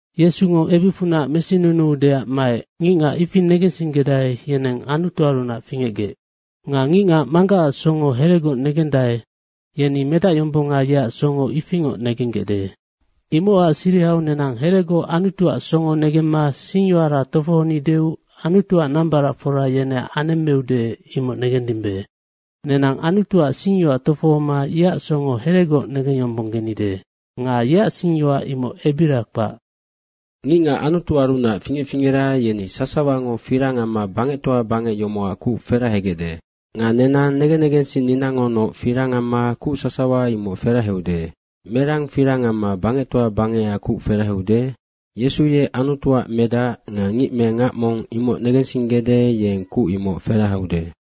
Yesungo ebicfunac mesinunuudeac maec, ngicngac ifi negensinggedae, yeneng Anutuarunac fingecgec. Nga ngicngac Manggacac songo heregoc negendae, yeni Medacyombonga yeac songo ifingoc negenggecde. Imocac sirihau nenang heregoc Anutuac songo negemma singyoara tofohonideu Anutuac nambaracfora yeneac anemmeude, imoc negendimbe. Nenang Anutuac singyoac tofohoma yeac songo heregoc negengyombonggenide. Nga yeac singyoac imoc ebira kpac. Ngicngac Anutuarunac fingec fingera, yeni sasawango firang amma bangectoa bangec yomocac kuc ferahegecde. Nga nenang negen negensinninangonoc firang amma bangectoa bangecac kuc sasawa feraheude. Merang firang amma bangectoa bangecac kuc ferahaude? Yesu ye Anutuac Medac nga ngic me ngac mong imoc negensinggede, yeng bangectoa bangecac kuc ferahaude.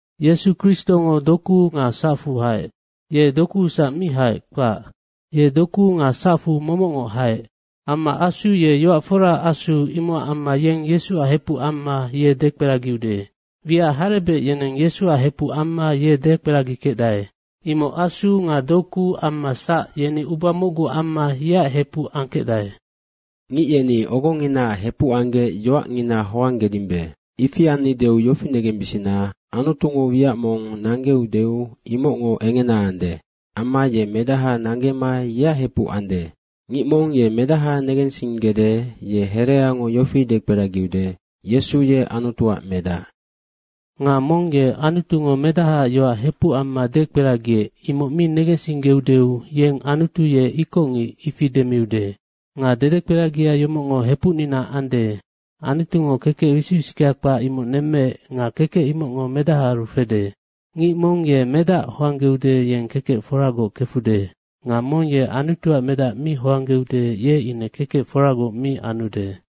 Yesu Kristongo dokuu nga sacfu haec. Ye dokuusac mi haec, kpac. Ye dokuu nga sacfu momocngoc haec. Amma Asu ye yoac foraac Asu, imocac amma yeng Yesuac hepuc amma ye dekperagiude. Wiac harebec yeneng Yesuac hepuc amma ye dekperagikecdae. Imoc Asu nga doku amma sac, yeni uba mocgu amma yeac hepuc angkecdae. Ngic yeni ogonginaac hepuc anggec yoacngina hoanggedimbe. Ifi annideu yofi negembisina, Anutungo wiac mong nanggeudeu imocngo engena ande. Amma ye medaha nanggema yeac hepuc ande. Ngic mong ye Medaha negensinggede, ye hereango yofi dekperagide, “Yesu ye Anutuac Medac.” Nga mong ye Anutungo Medahaac yoac hepuc amma dekperagiec, imoc mi negensinggeudeu, yeng Anutu ye ikocngic, ifi demiude. Nga dedekperagia yomocngo hepucnina ande, Anutungo kekec wisic wisickea kpac nemmeec nga kekec imocngo Medahaaru fede. Ngic mong ye Medac hoanggeude, yeng kekec foragoc kefude. Nga mong ye Anutuac Medac mi hoanggeude, ye ine kekec foragoc mi anude.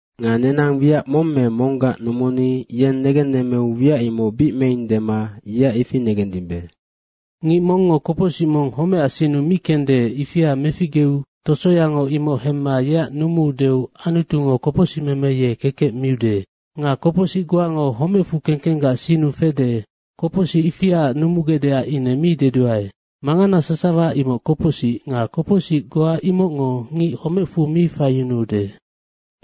Nga nenang wiac mong me monggac numuni yeng negennemmeu wiac imoc bic meing dema yeac ifi negendimbe. Ngic mongngo kopocsic mong homecac sinnu mi kende, ifia meficgeu tosoyango imoc hemma yeac numuudeu Anutungo kopocsicmeme ye kekec miude. Nga kopocsic goango homecfu kengkenggac sinnu fede, kopocsic ifiaac numugecdeac ine mi deduae. Mangana sasawa imoc kopocsic nga kopocsic goa imocngo ngic homecfu mi faiyunuude.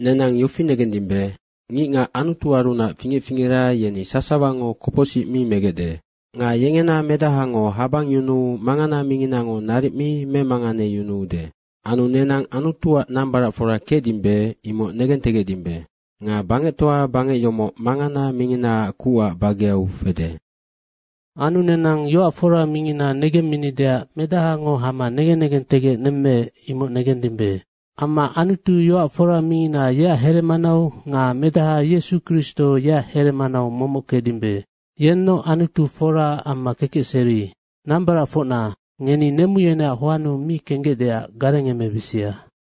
Nenang yofi negendimbe, ngicngac Anutuarunac fingec fingera, yeni sasawango kopocsic mi megecde. Nga yengena Medahango habangyunuu mangana minginango naric mi memanganeyunuude. Anu nenang Anutuac nambaracfora kecdimbe, imoc negentegecdimbe. Nga bangectoa bangec yomoc mangana minginaac kucac bageu fede. Anu nenang yoac fora Mingina negemminideac Medahango hama negen negentegec nemmeec, imoc negendimbe. Amma Anutu yoac fora mingina, yeac heremanau nga Medaha Yesu Kristo, yeac heremanau momoc kecdimbe. Yennoc Anutu fora amma kekecseri. Nambaracfocna, ngeni nemu yeneac hoannu mi kenggecdeac garengemebisia.